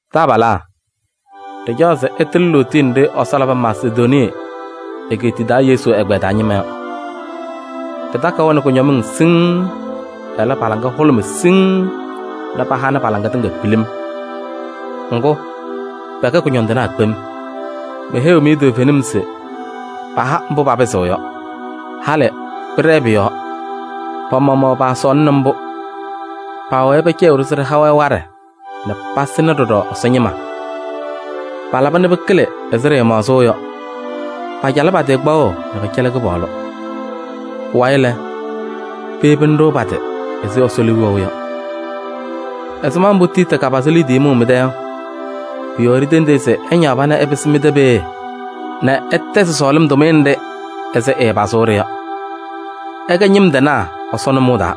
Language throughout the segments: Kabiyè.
Taabalaa, ɖɩcaɣ se ɩtɩlɩ lootiye nɖɩ Ɛsɔ labɩ Masedonii egeetiye taa Yesu agbaa taa ñɩma yɔ. Pɩtakɩ-wɛ nɛ kʋñɔmɩŋ siŋŋ, ɛlɛ, pa-laŋa hʋlʋmɩ siŋŋ nɛ pahanɩ pa-laŋa tɩŋa pilim. Ŋgʋ, pɛkɛ kʋñɔndɩnaa kpem. Meheyiɣ-mɩ toovenim se paha mbʋ papɩzɩɣ yɔ. Halɩ pɩɖɛɛ pʋ-yɔɔ. Pa-maɣmaɣ paasɔɔlɩnɩ mbʋ. Paawɛɛ pɛcɛyɩɣ-ɖʋ se ɖɩha-wɛ waɖɛ nɛ pasɩnɩ ɖɔɖɔ Ɛsɔ ñɩma. Palaba nɛ pɩkɩlɩ ɛzɩ ɖɩɩmaɣzʋʋ yɔ: pacalɩ pa-tɩ kpaɣʋ nɛ pɛcɛlɩ Kɩpaɣlʋ. Pʋwayɩ lɛ, peyebini-ɖʋ pa-tɩ ɛzɩ Ɛsɔ liu wɛʋ yɔ. Ɛzɩma mbʋ Tiiti kapazɩ liidiye mʋʋ mɩ-tɛ yɔ, pʋ-yɔɔ ɖitendi-i se ɛñaɣ pana ɛpɩsɩ mɩ-tɛ peeye nɛ ɛtɛzɩ sɔɔlɩm tʋmɩyɛ nɖɩ ɛzɩ ɛɛpazʋʋ-ɖɩ yɔ. Ɩkɛ ñɩm tɩnaa Ɛsɔ nʋmɔʋ taa: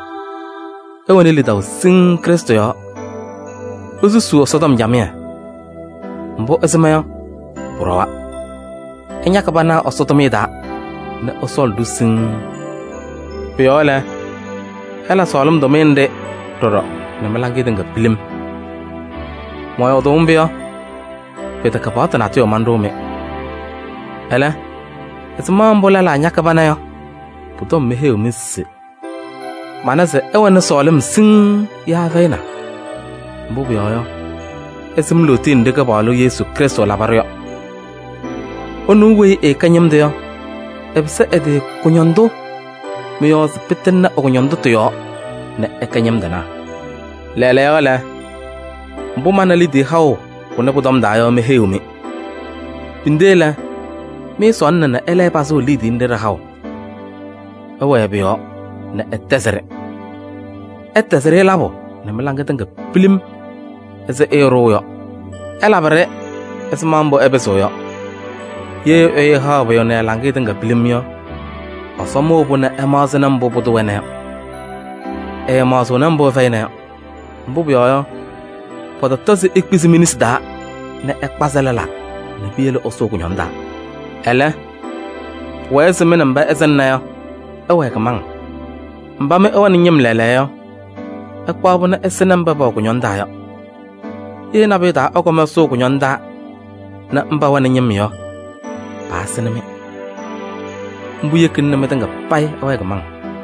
ɩwɛnɩ lidaʋ siŋŋ Krɩstʋ yɔɔ, isusuu Ɛsɔtɔm camɩyɛ. Mbʋ ɩsɩm yɔ pʋɖɔwa, ɩñakɩ pana Ɛsɔ tʋmɩyɛ taa nɛ ɩsɔɔlɩ-ɖʋ siŋŋ. Pʋ-yɔɔ lɛ, ɩla sɔɔlɩm tʋmɩyɛ nɖɩ ɖɔɖɔ nɛ mɩ-laŋɩyɛ tɩŋa pilim. Mɔyɔɔdʋʋ mbʋ yɔ, pɩtɛkɛ paɣtʋ natʋyʋ manɖʋʋ-mɩ. Ɛlɛ, ɛzɩma mbʋ lɛlaa ñakɩ pana yɔ pʋ-tɔm meheyiɣ-mɩ se mana se ɩwɛnɩ sɔɔlɩm siŋŋ yaa ɩfɛyɩna. Mbʋ pʋyɔɔ yɔ, ɩsɩm lootiye nɖɩ Kɩpaɣlʋ Yesu Krɩstʋ labɩ-ɖʋ yɔ. Ɛnʋ weyi ɛɛkɛ ñɩm tʋ yɔ, ɛpɩsɩ ɛ-tɩ kʋñɔndʋ mɩ-yɔɔ se pɩtɩŋnɩ ɛ-kʋñɔndʋtʋ yɔɔ nɛ ɩkɛ ñɩm tɩnaa. Lɛɛlɛɛyɔ lɛ, mbʋ mana liidiye haʋ pʋnɛ pʋ-tɔm taa yɔ meheyiɣ-mɩ. Pinde lɛ, mɩɩsɔɔlɩna nɛ ɩlɛyɩ pazʋʋ liidiye nɖɩ ɖɩ-haʋ. Ɩwɛɛ pʋ-yɔɔ nɛ ɩtɛzɩ-ɖɩ. Ɩtɛzɩ-ɖɩ labʋ nɛ mɩ-laŋɩyɛ tɩŋa ɛzɩ ɩɩɖʋʋ yɔ. Ɩlabɩ-ɖɩ ɛzɩma mbʋ ɩpɩzɩɣ yɔ. Ye ɛyʋ ɛhaɣ pʋyʋ nɛ ɛ-laŋɩyɛ tɩŋa pilim yɔ, Ɛsɔ mʋʋ-pʋ nɛ ɛmaɣzɩnɩ mbʋ pʋdʋ wɛna yɔ. Ɛɛmaɣzɩɣnɩ mbʋ ɛfɛyɩna yɔ. Mbʋ pʋyɔɔ yɔ, pɔtɔtɔ se ikpizi mi-nesi taa nɛ ɩkpazɩ lɛlaa nɛ piyele ɩsʋʋ kʋñɔŋ taa. Ɛlɛ, pʋwɛɛ se mɩ nɛ mba ɩsɩŋna yɔ, ɩwɛɛ kɩmaŋ. Mba mɩ ɩwɛnɩ ñɩm lɛɛlɛɛyɔ yɔ, ɩkpaɣ-pʋ nɛ ɩsɩnɩ mba pɛwɛ kʋñɔŋ taa yɔ. Ye nabʋyʋ taa ɩkɔm ɩsʋʋ kʋñɔŋ taa nɛ mba wɛnɩ ñɩm yɔ, paasɩnɩ-mɩ. Mbʋ yekina nɛ mɩtɩŋa payɩ ɩwɛɛ kɩmaŋ.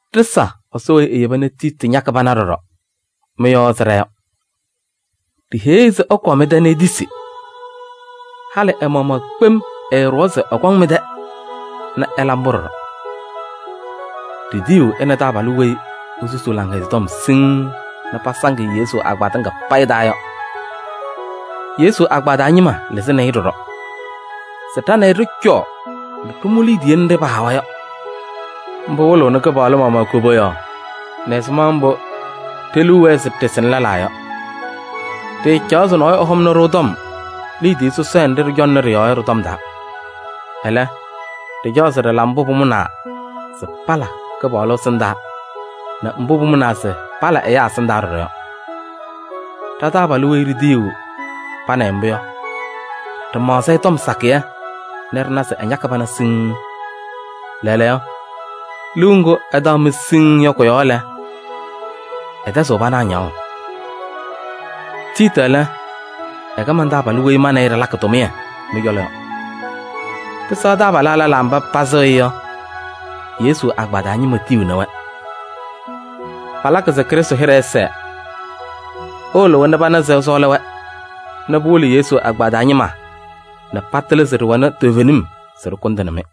Ɖɩsa Ɛsɔ weyi eyeba nɛ Tiiti ñakɩ pana ɖɔɖɔ mɩ-yɔɔ ɛzɩ ɖa yɔ. Ɖiheyi-i se ɛkɔɔ mɩ-tɛ nɛ etisi. Halɩ ɛ-maɣmaɣ kpem ɛɛɖʋwa se ɛkɔŋ mɩ-tɛ nɛ ɛla mbʋ ɖɔɖɔ. Ɖitiyiɣ ɛ nɛ taabalʋ weyi esusi Laŋhɛzɩyɛ Tɔm siŋŋ nɛ pasaŋ-ɩ Yesu agbaa tɩŋa payɩ taa yɔ. Yesu agbaa taa ñɩma lɩzɩnɩ-ɩ ɖɔɖɔ se ɖa nɛ ɩ ɖɩcɔɔ nɛ ɖɩmʋ liidiye nɖɩ pahawa yɔ. Mbʋ wɩlɩɣnɩ Kɩpaɣlʋ maɣmaɣ koboyaɣ nɛ ɛzɩma mbʋ ɖe-liu wɛɛ se ɖɩsɩnɩ lɛlaa yɔ. Ɖɩɩcaɣ se nɔɔyʋ ɛhɔmnɩ-ɖʋ tɔm liidiye sɔsɔɖɛ nɖɩ ɖɩcɔŋnɩ ɖɩ-yɔɔ yɔ tɩ-tɔm taa. Ɛlɛ, ɖɩcaɣ se ɖɩla mbʋ pʋmʋnaa se pala Kɩpaɣlʋ ɛsɩndaa nɛ mbʋ pʋmʋnaa se pala ɛyaa ɛsɩndaa ɖɔɖɔ yɔ. Ɖa-taabalʋ weyi ɖitiyiɣ pa nɛ ɩ mbʋ yɔ, ɖɩmaɣzɩ-ɩ tɔm sakɩyɛ nɛ ɖɩna se ɛñakɩ pana siŋŋ. Lɛɛlɛɛyɔ, liu ŋgʋ ɛtaɣ-mɩ siŋŋ yɔ kʋ-yɔɔ lɛ, ɛtɛzɩɣ pana ñaɣʋ. Tiiti lɛ, ɛkɛ man-taabalʋ weyi ma nɛ ɩ ɖɩlakɩ tʋmɩyɛ mɩ-cɔlɔ yɔ. Pɩsɛɣ taabalaa lɛlaa mba pasɩɣ-ɩ yɔ, Yesu agbaa taa ñɩma tiyiɣni-wɛ. Palakɩ se Krɩstʋ hɩɖɛ ɛsɛɛ. Ɩwɩlɩ-wɛ nɛ pana se ɩsɔɔlɩ-wɛ nɛ pɩwɩlɩ Yesu agbaa taa ñɩma nɛ patɩlɩ se ɖɩwɛnɩ toovenim se ɖɩkʋndɩnɩ-mɩ.